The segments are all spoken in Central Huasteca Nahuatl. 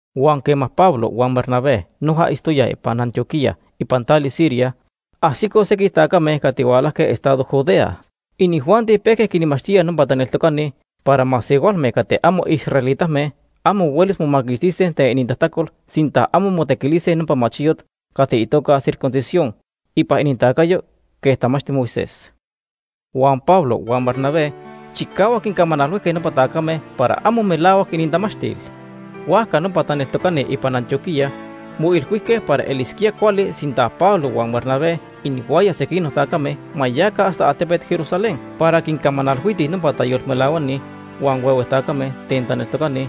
Huan quema Pablo huan Bernabé noja itztoyaj ipan Antioquía ipan tali Siria, ajsicoj sequij tacame cati hualajque estado Judea. Inijuanti pejque quinmachtíaj nopa taneltocani para masehualme cati amo israelitame amo huelis momaquixtise ten inintajtacol sinta amo motequilise nopa machiyot cati itoca circuncisión ipan inintacayo quej tamachti Moisés. Huan Pablo huan Bernabé chicahuac quincamanalhuijque nopa tacame para amo melahuac inintamachtil. Huajca nopa taneltocani ipan Antioquía moilhuijque para elisquía cuali sinta Pablo huan Bernabé inihuaya sequinoc tacame ma yaca hasta altepet Jerusalén para quincamanalhuitij nopa tayolmelahuani huan huehue tacame ten taneltocani,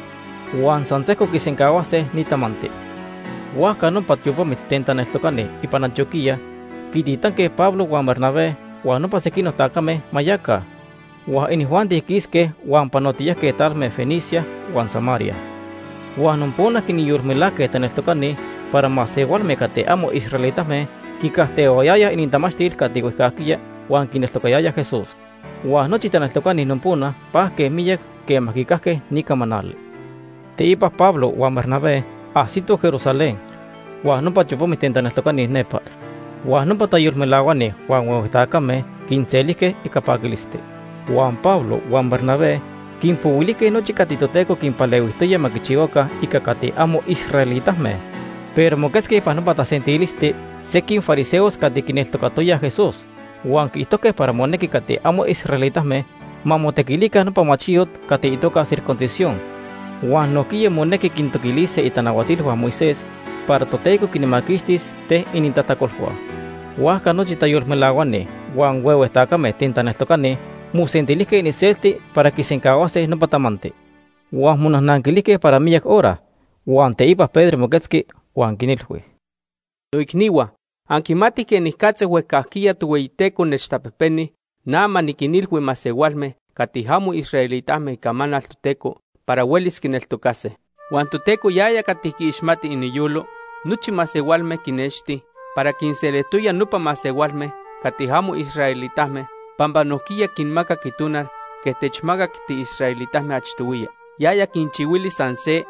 huan san sejco quisencahuase ni tamanti. Huajca nopa tiopamit ten taneltocani ipan Antioquía quititanque Pablo huan Bernabé huan nopa sequinoc tacame ma yaca. Huan inijuanti quisque huan panotiyajque talme Fenicia huan Samaria. Huan nopona quinyolmelajque taneltocani para masehualme cati amo israelitame quicajtehuayayaj inintamachtil cati huejcajquiya huan quineltocayayaj Jesús. Huan nochi taneltocani nopona pajque miyac quema quicajque ni camanali. Teipa Pablo huan Bernabé ajsitoj Jerusalén huan nopa tiopamit ten taneltocani nepa, huan nopa tayolmelahuani huan huehue tacame quinselijque ica paquilisti. Huan Pablo huan Bernabé quinpohuilijque nochi cati Toteco quinpalehuijtoya ma quichihuaca ica cati amo israelitame. Pero moquetzque ipan nopa tasentilisti sequij fariseos cati quineltocatoyaj Jesús huan quiijtojque para monequi cati amo israelitame ma motequilica nopa machiyot cati itoca circuncisión huan nojquiya monequi quintoquilise itanahuatilhua Moisés para Toteco quinmaquixtis ten inintajtacolhua. Huajca nochi tayolmelahuani huan huehue tacame ten taneltocani mosentilijque iniselti para quisencahuase nopa tamanti. Huan monajnanquilijque para miyac hora, huan teipa Pedro moquetzqui huan quinilhui: ―Noicnihua, anquimatij quenicatza huejcajquiya Tohueyiteco nechtapejpeni na ma niquinilhui masehualme cati amo israelitame icamanal Toteco para huelis quineltocase. Huan Toteco yaya cati quiixmati iniyolo nochi masehualme quinexti para quinselijtoya nopa masehualme cati amo israelitame pampa nojquiya quinmacac Itonal quej techmacac tiisraelitame achtohuiya. Yaya quinchihuili san se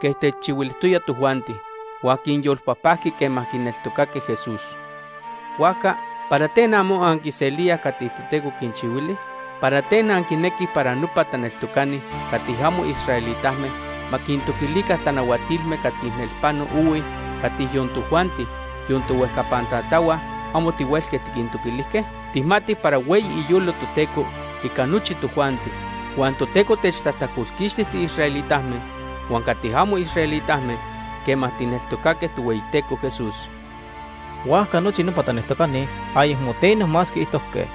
quej techchihuilijtoya tojuanti, huan quinyolpajpajqui quema quineltocaque Jesús. Huajca ¿para ten amo anquiselíaj cati Toteco quinchihuili? ¿Para ten anquinequij para nopa taneltocani cati amo israelitame ma quintoquilica tanahuatilme cati nelpano ohui cati yon tojuanti, yon tohuejcapan tatahua, amo tihuelque tiquintoquilijque? Tijmatij para hueyi iyolo Toteco ica nochi tojuanti. Huan Toteco techtajtacolquixti tiisraelitame huan cati amo israelitame quema tijneltocaque Tohueyiteco Jesús. Huajca nochi nopa taneltocani ayecmo teno más quiijtojque.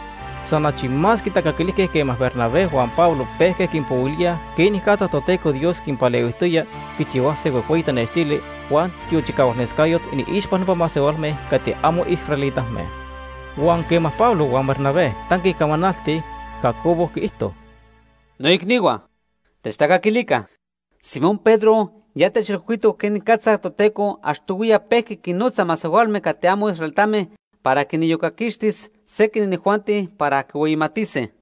San achi más quitacaquilijque quema Bernabé huan Pablo pejque quinpohuilíaj quenicatza Toteco Dios quinpalehuijtoya quichihuase huejhueyi tanextili huan tiochicahualnescayot iniixpa nopa masehualme cati amo israelitame. Huan quema Pablo huan Bernabé tanque camanaltij, Jacobo quiijto: ―Noicnihua, techtacaquilica. Simón Pedro ya techilhuijtoc quenicatza Toteco achtohuiya pejqui quinnotza masehualme cati amo israelitame para quiniyocaquixtis sequij inijuanti para quihueyimatise.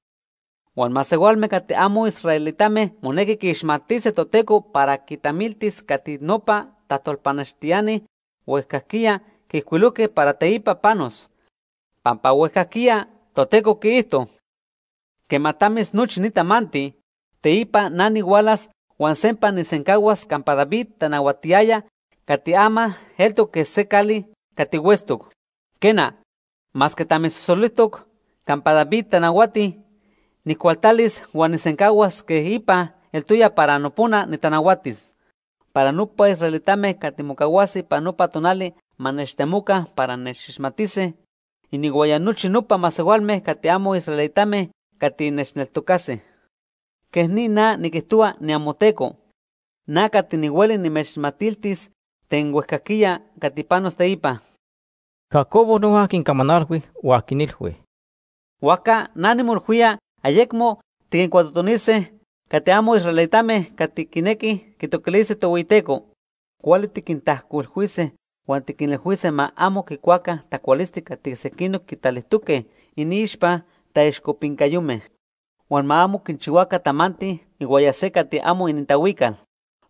Huan masehualme cati amo israelitame monequi quiixmatise Toteco para quitamiltis cati nopa tajtolpanextiani huejcajquiya quiijcuilojque para teipa panos. Pampa huejcajquiya Toteco quiijto: ‘Quema tamis nochi ni tamanti, teipa na nihualas huan sempa nijsencahuas campa David tanahuatiyaya cati ama eltoc quej se cali cati huetztoc. Quena, masque tamisosolijtoc campa David tanahuati, nijcualtalis huan nijsencahuas quej ipa eltoya para nopona nitanahuatis. Para nopa israelitame cati mocahuase ipan nopa tonali ma nechtemoca para nechixmatise, inihuaya nochi nopa masehualme cati amo israelitame cati nechneltocase. Quej ni na niquijtohua, niamoTeco. Na cati nihueli nimechmatiltis ten huejcajquiya cati panos teipa.’ Jacobo noja quincamanalhui huan quinilhui: ―Huajca na nimoilhuía ayecmo tiquincuatotonise cati amo israelitame cati quinequij quitoquilise Tohueyiteco. Cuali tiquintajcuilhuise huan tiquinilhuise ma amo quicuaca tacualisti cati sequinoc quitalijtoque iniixpa taixcopincayome. Huan ma amo quichihuaca tamanti ihuaya se cati amo inintahuical.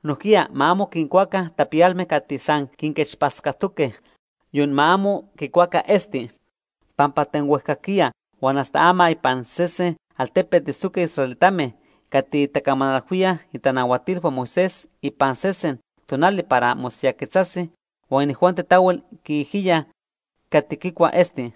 Nojquiya ma amo quincuaca tapiyalme cati san quinquechpatzcatoque. Yon ma amo quicuaca esti, pampa ten huejcajquiya huan hasta ama ipan sese altepet itztoque israelitame cati tacamanalhuíaj itanahuatilhua Moisés ipan sesen tonali para mosiyajquetzase huan inijuanti tahuel quiijiyaj cati quicua esti.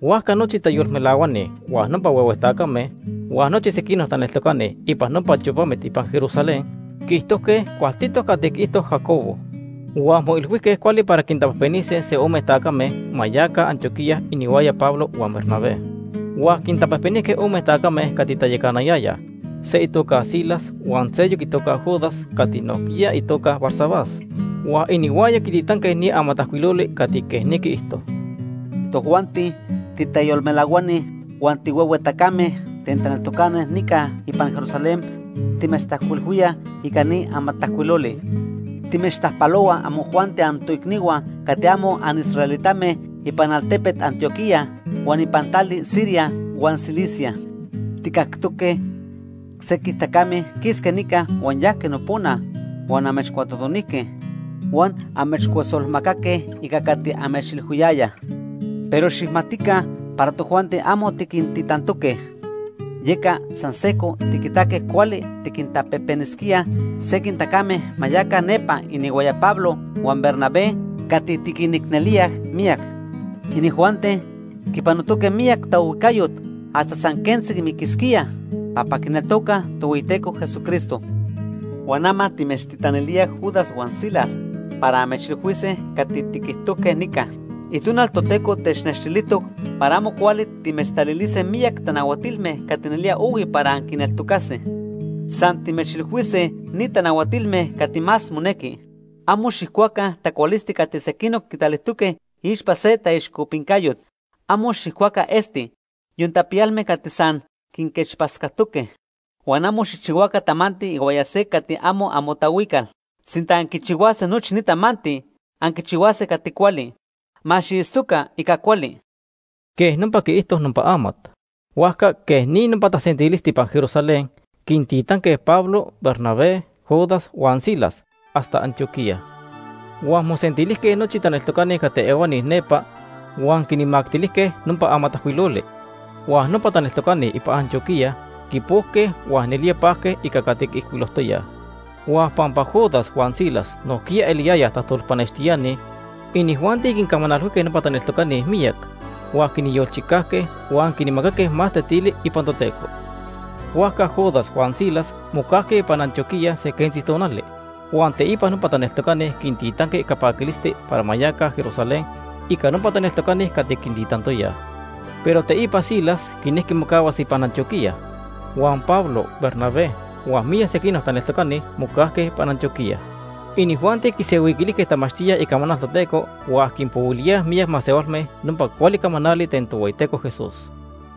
Huajca nochi tayolmelahuani, huan nopa huehue tacame huan nochi sequinoc taneltocani ipan nopa tiopamit ipan Jerusalén quiijtojque cualtitoc cati quiijto Jacobo. Huan moilhuijque cuali para quintapejpenise se ome tacame ma yaca Antioquía inihuaya Pablo huan Bernabé. Huan quintapejpenijque ome tacame cati tayacanayayaj, se itoca Silas huan seyoc itoca Judas cati nojquiya itoca Barsabás. Huan inihuaya quititanque ni amatajcuiloli cati quej ni quiijto: Tojuanti titayolmelahuani huan tihuehue tacame ten taneltocani nica ipan Jerusalén timechtajcuilhuíaj ica ni amatajcuiloli. Timechtajpalohuaj amojuanti antoicnihua cati amo anisraelitame ipan altepet Antioquía huan ipan tali Siria huan Cilicia. Tijcactoque sequij tacame quisque nica huan yajque nopona huan amechcuatotonijque huan amechcuesolmacaque ica cati amechilhuiyayaj, pero xijmatica para tojuanti amo tiquintitantoque. Yeca san sejco tiquitaque cuali tiquintapejpenisquíaj sequij tacame ma yaca nepa inihuaya Pablo huan Bernabé cati tiquinicnelíaj miyac. Inijuanti quipanotoque miyac taohuijcayot hasta san quentzi miquisquíaj pampa quineltocaj Por notoca. Tohueyiteco Jesucristo. Huan ama timechtitanilíaj Judas huan Silas para amechilhuise cati tiquijtojque nica. Itonal Toteco technextilijtoc para amo cuali timechtalilise miyac tanahuatilme cati nelía ohui para anquineltocase. San timechilhuise ni tanahuatilme cati más monequi: Amo xijcuaca tacualisti cati sequinoc quitalijtoque iixpa se taixcopincayot. Amo xijcuaca esti, yon tapiyalme cati san quinquechpatzcatoque. Huan amo xijchihuaca tamanti ihuaya se cati amo amotahuical. Sinta anquichihuase nochi ni tamanti, anquichihuase cati cuali. Ma xiitztoca ica cuali. Quej nopa quiijto nopa amat. Huajca quej ni nopa tasentilisti ipan Jerusalén quintitanque Pablo, Bernabé, Judas huan Silas hasta Antioquía. Huan mosentilijque nochi taneltocani cati ehuani nepa huan quinmactilijque nopa amatajcuiloli. Huan nopa taneltocani ipan Antioquía quipojque huan nelía pajque ica cati quiijcuilojtoyaj. Huan pampa Judas huan Silas nojquiya eliyayaj tajtolpanextiani, inijuanti quincamanalhuijque nopa taneltocani miyac, huan quinyolchicajque huan quinmacaque más tetili ipan Toteco. Huajca Judas huan Silas mocajque ipan Antioquía se quentzi tonali, huan teipa nopa taneltocani quintitanque ica paquilisti para ma yaca Jerusalén ica nopa taneltocani cati quintitantoyaj. Pero teipa Silas quinejqui mocahuas ipan Antioquía. Huan Pablo, Bernabé huan miyac sequinoc taneltocani mocajque ipan Antioquía. Inijuanti quisenhuiquilijque tamachtíaj icamanal Toteco huan quinpohuilíaj miyac masehualme nopa cuali camanali ten Tohueyiteco Jesús.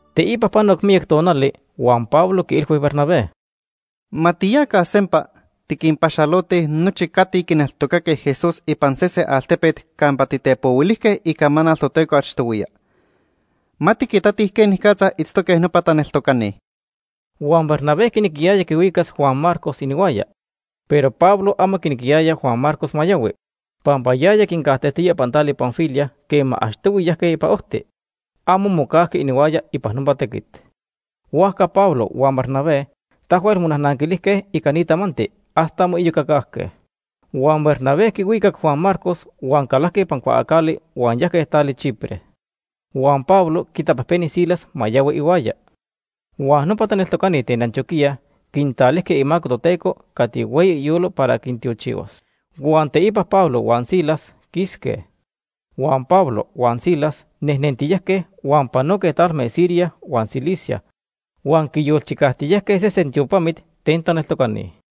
Teipa panoc miyac tonali, huan Pablo quiilhui Bernabé: ―Ma tiyaca sempa, tiquinpaxalotij nochi cati quineltocaque Jesús ipan sese altepet campa titepohuilijque icamanal Toteco achtohuiya. Ma tiquitatij quenicatza itztoque nopa taneltocani. Huan Bernabé quinequiyaya quihuicas Juan Marcos inihuaya, pero Pablo amo quinequiyaya Juan Marcos ma yahui, pampa yaya quincajtejtoya ipan tali Panfilia quema achtohui yajque ipan ojti. Amo mocajqui inihuaya ipan nopa tequit. Huajca Pablo huan Bernabé tahuel monajnanquilijque ica ni tamanti hasta moiyocacajque. Huan Bernabé quihuicac Juan Marcos huan calajque ipan cuaacali huan yajque tali Chipre. Huan Pablo quitapejpeni Silas ma yahui ihuaya. Huan nopa taneltocani ten Antioquía quintalijque imaco Toteco cati hueyi iyolo para ma quintiochihuas. Huan teipa Pablo huan Silas quisque. Huan Pablo huan Silas nejnentiyajque, huan panoque talme Siria huan Cilicia huan quiyolchicajtiyajque sesen tiopamit ten taneltocani.